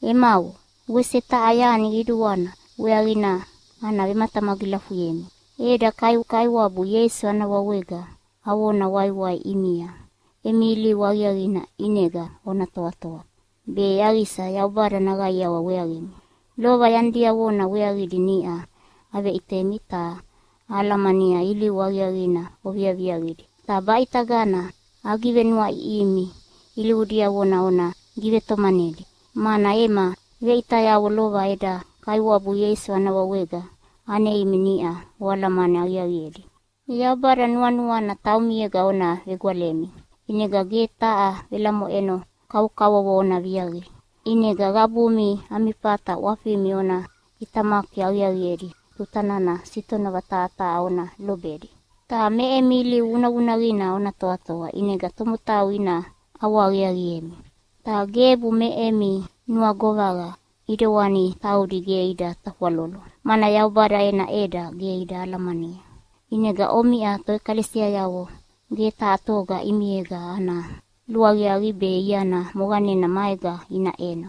Emavo, wese taha yani qiduana weaqina ana vematamagilafuyemi. Eda Kaiwabu Ieisu ana wawega avona waiwai ʼimia emi ilivu aqiaqina ʼinega ona toatoa, be yaqisa Yaubada naqaiawa weaqimi. Lova yani diavona weaqidi niʼa aveʼitemi, ta ahalamania ilivu aqiaqidi oviaviaqidi. Ta baʼitagana agivenuaʼiʼihimi ilivu diavona ona givetomanedi. Mana ema veʼitayavo lova eda Kaiwabu Ieisu ana wawega aneimi niʼa oalamani aqiaqiedi. Yaubada nuanuana taumiega ona vegwalemi, ʼinega ge taha velamoʼeno kavokavovo ona viaqi. ʼInega qabumi ami fata ʼwafimi ona ʼitamaki aqiaqiedi tuta nana sitonova taha taha ona lobedi, ta me emi ilivu vunavunaqina ona toatoa ʼinega tomotau ina ʼawahaqiaqiemi. Ta gebu me emi nuagovaqa ʼidewana taudi ge ida tafwalolo, mana Yaubada ena ʼeda ge ida alamania. ʼInega omiʼa toʼekalesiayavo ge taha toga ʼimiega ana luaqiaqi be iana moqanena maega ina ʼeno,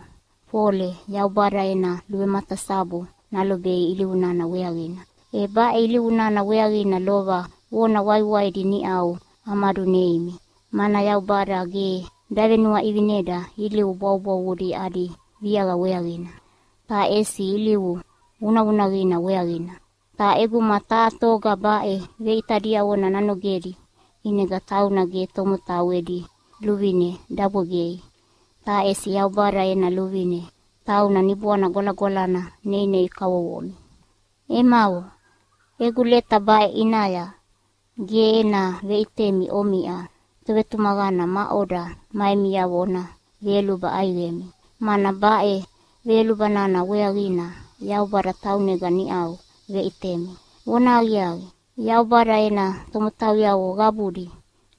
fole Yaubada ena luvematasabu nalobei ilivu nana weaqina. E baʼe ilivu nana weaqina lova vona waiwaidi niʼau amaduneimi. Mana Yaubada ge davenuaʼivineda ilivu bwavubwavudi adi viaqa weaqina, ta ʼesi ilivu vunavunaqina weaqina. Ta ʼeguma taha toga baʼe veʼita diavona nanogedi ʼinega tauna ge tomotau edi luvine dabwegei, ta ʼesi Yaubada ena luvine, tauna Niboana Gwalagwalana neinei kavovomi. Emavo, egu leta baʼe ʼinaya ge ena veʼitemi omiʼa tovetumaqana maʼoda ma emiavo ona veyoluba ʼaiqemi, mana baʼe veyoluba nana weaqina Yaubada taunega niʼau veʼitemi. Vonahaqiaqi, Yaubada ena tomotauyavo qabudi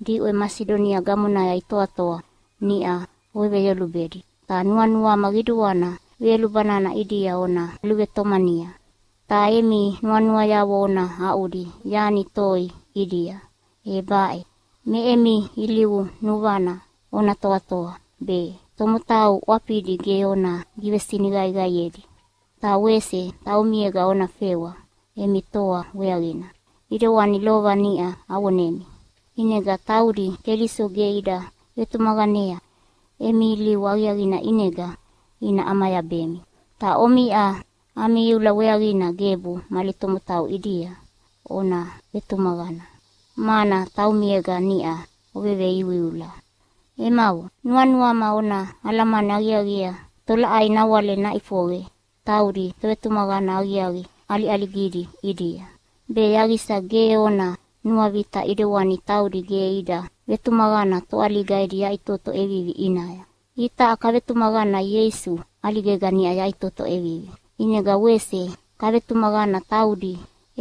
diʼwe Masidonia gamonaya itoatoa niʼa oveveyolubedi, ta nuanuama qiduana veyoluba nana ʼidia ona luvetomania. Ta emi nuanuayavo ona aʼudi yani toi ʼidia, e baʼe: Me emi ilivu nuvana ona toatoa be, tomotau ʼwafidi ge ona givesiniqaiqaiedi, ta wese taumiega ona fewa emi toa weaqina, ʼidewani lova niʼa avonemi. ʼInega taudi Keliso ge ida vetumaqanea emi ilivu aqiaqina ʼinega ina ʼamayabemi. Ta omiʼa ami iula weaqina gebu mali tomotau ʼidia ona vetumaqana, mana taumiega niʼa oveveiuiula. Emavo, nuanuama ona alamani aqiaqiea tolaʼai nawale naʼifoqe taudi tovetumaqana aqiaqi ʼaliʼaligidi ʼidia, be yaqisa ge ona nuavita ʼidewani taudi ge ida vetumaqana toʼaliga edi yaʼitoto ʼevivi ʼinaya. Itaʼa kavetumaqana Ieisu ʼaligega niʼa yaʼitoto ʼevivi, ʼinega wese kavetumaqana taudi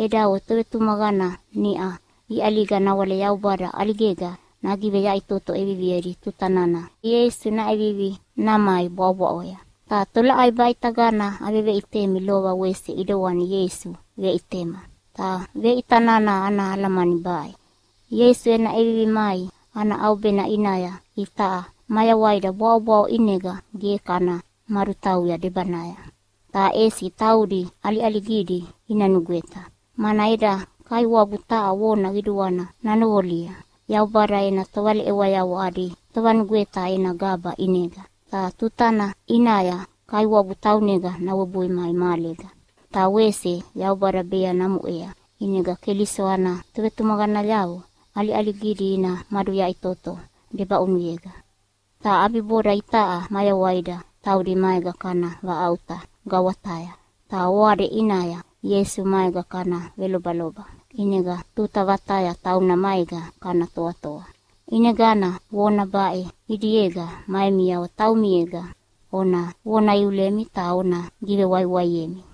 edavo tovetumaqana niʼa iʼaliga nawale Yaubada ʼaligega nagiveyaʼitoto ʼeviviedi tuta nana Ieisu naʼevivi namai bwaʼobwaʼoya. Ta tolaʼai baʼitagana aveveʼitemi lova wese ʼidewana Ieisu veʼitema. Ta veʼita nana ana alamani baʼe: Ieisu ena ʼevivi mai ana ʼaubena ʼinaya itaʼa mayawaida bwaʼobwaʼo ʼinega ge kana madutauya debanaya, ta ʼesi taudi ʼaliʼaligidi ina nugweta. Mana eda Kaiwabu taha vona qiduana nanoqolia Yaubada ena tovaleʼewayavo adi tovanugweta ena gaba ʼinega, ta tutana ʼinaya Kaiwabu taunega nawebui mai mahalega. Ta wese Yaubada bea namuʼea, ʼinega Keliso ana tovetumaqanayavo ʼaliʼaligidi ina maduyaʼitoto debaʼunuyega. Ta ʼabiboda itaʼa mayawaida taudi maega kana vaʼauta gawataya, ta oade ʼinaya Ieisu maega kana velobaloba, ʼinega tuta vataya tauna maega kana toatoa. ʼInegana vona baʼe ʼidiega ma emiavo taumiega ona vona iulemi ta ona givewaiwaiemi.